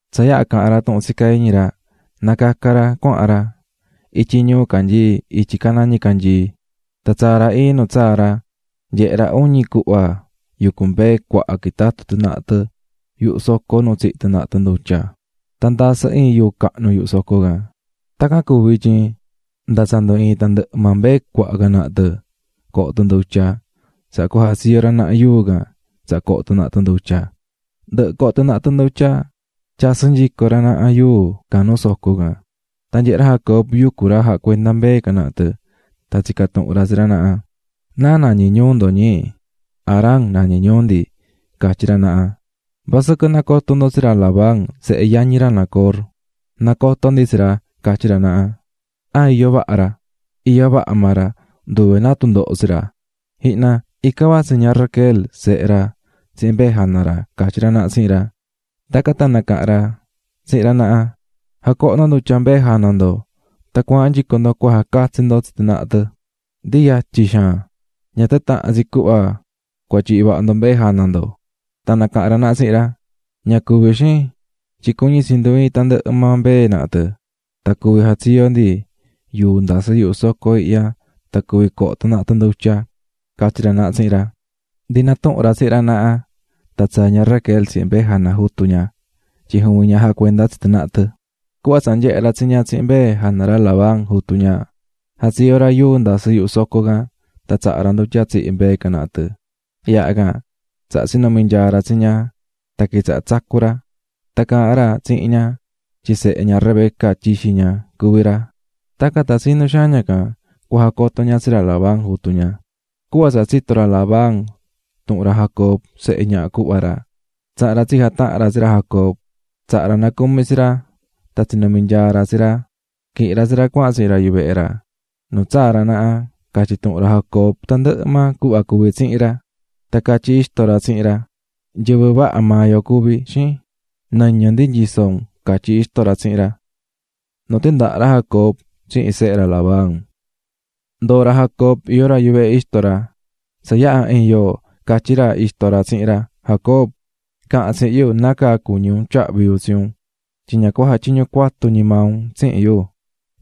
Tsa yaha caha̱n ra tuhun tsicá iñi ra, nacaca̱ ra cuahan ra ityi ñuu canyií ityi caná ñicanyii. Tan tsaa̱ ra iin nu tsaa̱ ra, nyehe̱ ra uñi cuhva yucú mbee cuaha quitatú tɨ naha tɨ yuhu soco nu tsihí tɨ naha tɨ ndutya, tan ndasɨ́ iin yuu cahnu yuhu soco can. Tacan cuvi̱ tyin, nda tsa ndu iin tandɨhɨ maa mbee cuaha can naha tɨ coho tɨ ndutya, tsaha cua jatsiyo ra naha yuu can tsaha coho tɨ naha tɨ ndutya, ndɨhɨ coho tɨ naha tɨ ndutya, tyasɨ́ nyico ra naha yuu can nuu soco can. Tan nyehe̱ ra Jacob yucú ra jacuendá mbee can naha tɨ, tan tsica̱ tuhun ra tsi ra naha: --¿Náa nañí ñuu ndo, ñi? --Harán, nañí ñuu ndi--catyí ra naha. ―¿Vasɨquɨ nacotó ndo tsi ra Labán, sehe yañi ra Nacor? --Nacotó ndi tsi ra --catyí ra naha. ―¿An iyó vaha ra? ―Iyó vaha maa ra nduve náa tundoho tsi ra. Ji̱hna, ican vatsí ña Raquel, sehe ra, tsihin mbee jana ra ―catyí ra naha tsihin ra. Tacan tan nacaha̱n ra tsihin ra naha: --Ja̱coho ndo ndutya mbee jana ndo tan cua̱ahan nyico ndo cua jacatsi ndo tsi tɨ naha tɨ, ndi yatyi xaan, ña tan tahan tsi cuhva cua tyihi vaha ndo mbee jana ndo. Tan nacaha̱n ra naha tsihin ra: --Ña cuví, xin, tyin cuñí tsi ndu iin tandɨhɨ maa mbee naha tɨ tan cuví jatsiyo ndi yuu ndasɨ́ yuhu soco ihya tan cuvi coho tɨ naha tɨ ndutya --catyí ra naha tsihin ra. Ndi natuhún ra tsihin ra naha, tan tsaa̱ ña Raquel tsihin mbee jana jutu ña, tyin juvin ña jacuendá tsi tɨ naha tɨ. Cuhva tsa nyehe̱ ra tsi ña tsihin mbee jana ra Labán, jutu ña, jatsiyo̱ ra yuu ndasɨ́ yuhu soco can tan tsaha̱ ra ndutya tsihi̱ mbee can naha tɨ. Yaha can tsaha tsinumi̱ nyaa ra tsi ña tan quitsaha̱ tsacú ra. Tan caahán ra tsihin ña tyin sehe ña Rebeca, tyixi ña, cuví ra, tacan tan tsinú xaan ña can cua jacoto ña tsi ra Labán, jutu ña. Cuhva tsa tsito̱ ra Labán tuhun ra Jacob, sehe ñaha cuhva ra, tsaha̱n ra tsi jataha̱n ra tsi ra Jacob, tsaha̱ ra nacumi tsi ra, tan tsinumi̱ nyaa ra tsi ra, quihi̱n ra tsi ra cuahan tsihin ra yuvehe ra. Nu tsaa̱ ra naha, catyi̱ tuhun ra Jacob tandɨhɨ maa cuhva cuvi̱ tsihin ra. Tan catyí ixto ra tsihin ra: --Nyɨvɨ vaha maa yo cuví, xin, nɨñɨ ndi nyisó un ―catyí ixto ra tsihin ra. Nu tindaha̱ ra Jacob tsihin sehe ra Labán Ndoo̱ ra Jacob iyó ra yuvehe ixto ra. Tsa yaha̱ iin yoo, catyí ra ixto ra tsihin ra: --Jacob, caha̱n tsihin yu nácaa cuñí un tyahví yu tsi un, tyin ña cua jatyiñu cuatu ñi maa un tsihin yu,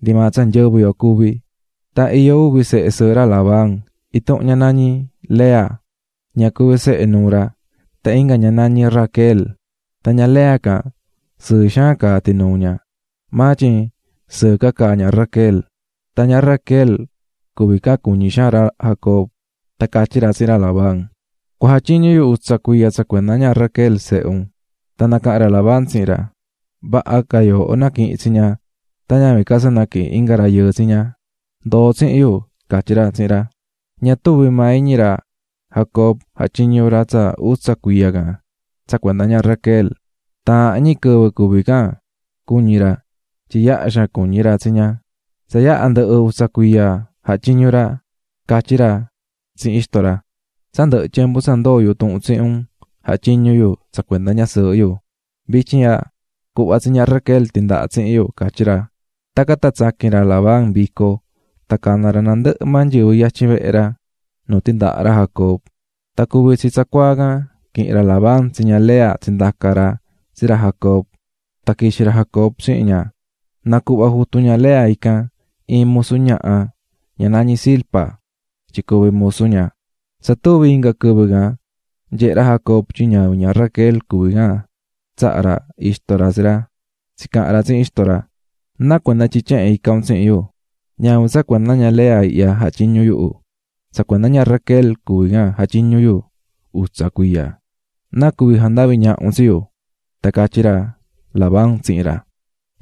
ndi maa tsa nyɨvɨ yo cuví. Tan iyó uvi sehe sɨɨhɨ ra Labán: Intuhun ña nañí Lea, ña cuví sehe nuu ra, tan inga ña nañí Raquel. Tan ña Lea can sɨɨ xaan caá tinuu ña, maa tyin, sɨɨ ca caá ña Raquel. Tan ña Raquel can cuñí xaan ra Jacob, tan catyí ra tsihin ra Labán: --Cua jatyiñu yu utsa cuiya tsa cuenda ña Raquel, sehe un. Tan nacaha̱n ra Labán tsihin ra: ―Vaha ca yooho naquihin tsi ña tan ñavin ca tsa naquihin inga rayɨɨ tsi ña. Ndo̱o tsihin yu --catyí ra tsihin ra. Ña tuvi̱ maa iñi ra Jacob jatyiñu̱ ra tsa utsa cuiya can tsa cuenda ña Raquel; taahan ñi quɨvɨ cuví can cuñí ra, tyin yaha xaan cuñí ra tsi ña. Tsa yaha ndɨhɨ utsa cuiya jatyiñu̱ ra, catyí ra tsihin ixto ra: --Tsa ndɨhɨ̱ tyembu tsa ndoo̱ yu tuhun tsihin un jatyiñu̱ yu tsa cuenda ñasɨɨhɨ yu. Vityin ihya, cu̱hva tsi ña Raquel tindaha tsihin yu ―catyí ra. Tacan tan tsaqui̱n ra Labán vico tan cana̱ ra nandɨhɨ maa nyɨvɨ yatyin vehe ra, nu tindaha̱ ra Jacob. Tan cuvi̱ tsi tsacuaa can, quihi̱n ra Labán tsi ña Lea tsindaca̱ ra tsi ra Jacob, tan quixi̱ ra Jacob tsihin ña. Nacuhva̱ jutu ña Lea ican iin musu ñaha, ña nañí Zilpa, tyin cuvi musu ña. Tsa tuvi inga quɨvɨ, nyehe̱ ra Jacob tyin ñavin ña Raquel tsaha̱ ixto ra tsi ra. Tsicaha̱n ra tsihin ra: --¿Náa cuenda tyin tyehen ica̱ un tsihin yu? Ñavin tsa cuenda ña Lea ihya jatyiñu̱ yuhu, tsa cuenda ña Raquel jatyiñu̱ yu utsa cuiya. ¿Náa cuvi̱ jandavi̱ ñaha un tsi yu? Tan catyí ra Labán tsihin ra: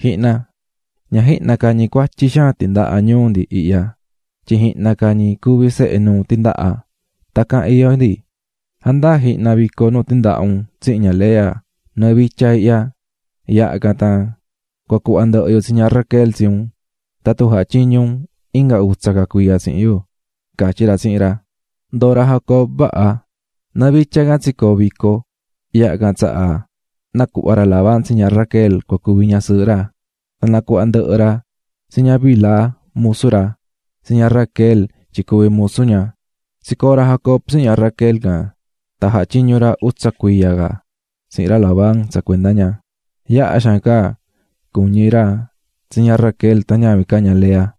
--Ji̱hna, ña jihna ca ñi cuatyi xaan tindaha nuu ndi ihya, tyin jihna ca ñi cuví sehe nuu tindaha, tacan iyó ndi. Ja̱ndaa jihna vico nu tindaha̱ un tsihin ña Lea nɨɨ vitya ihya, yaha can tan cua cuhva ndɨhɨ yu tsi ña Raquel tsi un tatun jatyiñu un inga utsa ca cuiya tsihin yu --catyí ra tsihin ra. Ndoo̱ ra Jacob vaha, nɨɨ vitya can tsicoo̱ vico, yaha can tsaha nacuhva̱ ra Labán tsi ña Raquel cua cuvi ñasɨɨhɨ ra. Tan nacuhva̱ ndɨhɨ ra tsi ña Bilha musu ra, tsi ña Raquel, tyin cuvi musu ña. Tsicoo̱ ra Jacob tsihin ña Raquel can, tan jatyiñu̱ ra utsa cuiya ca tsihin ra Labán tsa cuenda ña. Yaha xaan ca cuñí ra tsi ña Raquel tan ñavin ca ña Lea.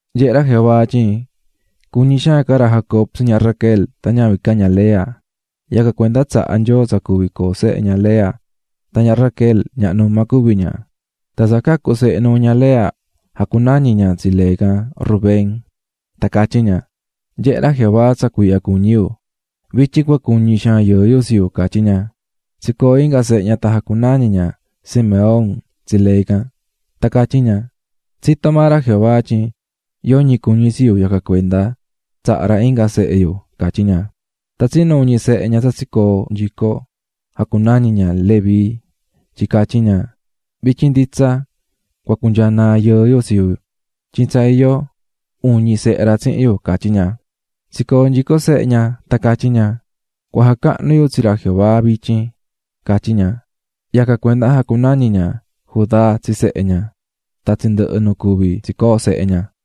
Nyehé ra Jehová tyin cuñí xaan ca ra Jacob tsi ña Raquel tan ñavin ca ña Lea, yacan cuenda tsaha̱ Nyoo tsa cuvi coo sehe ña Lea tan ña Raquel ñaha numa cuví ña. Tan tsa cacu̱ sehe nuu ña Lea jacunañi̱ ña tsi lee can Rubén, tan catyí ña: "Nyehé ra Jehová tsa cuiihya cuñí yu, vityin cua cuñi xaan yɨɨ yu tsi yu", catyí ña. Tsicoo̱ inga sehe ña tan jacunañi̱ ña Simeón tsi lee can, tan catyí ña: "Tsitó maa ra Jehová tyin yoñi cuñí tsi yu yacan cuenda tsaha̱ ra inga sehe yu", catyí ña. Tan tsinu uñi sehe ña tsa tsicoo̱ nyico jacunañi̱ ña Leví tyin catyí ña: "Vityin nditsa cua cunyaa naa yɨɨ yu tsi yu, tyin tsa iyó uñi sehe ra tsihin yu", catyí ña. Tsicoo̱ nyico sehe ña, tan catyí ña: "Cua jacahnu yu tsi ra Jehová vityin", catyí ña. Yacan cuenda jacunañi̱ ña Judá tsi sehe ña. Tan tsindɨhɨ̱ nu cuví tsicoó sehe ña.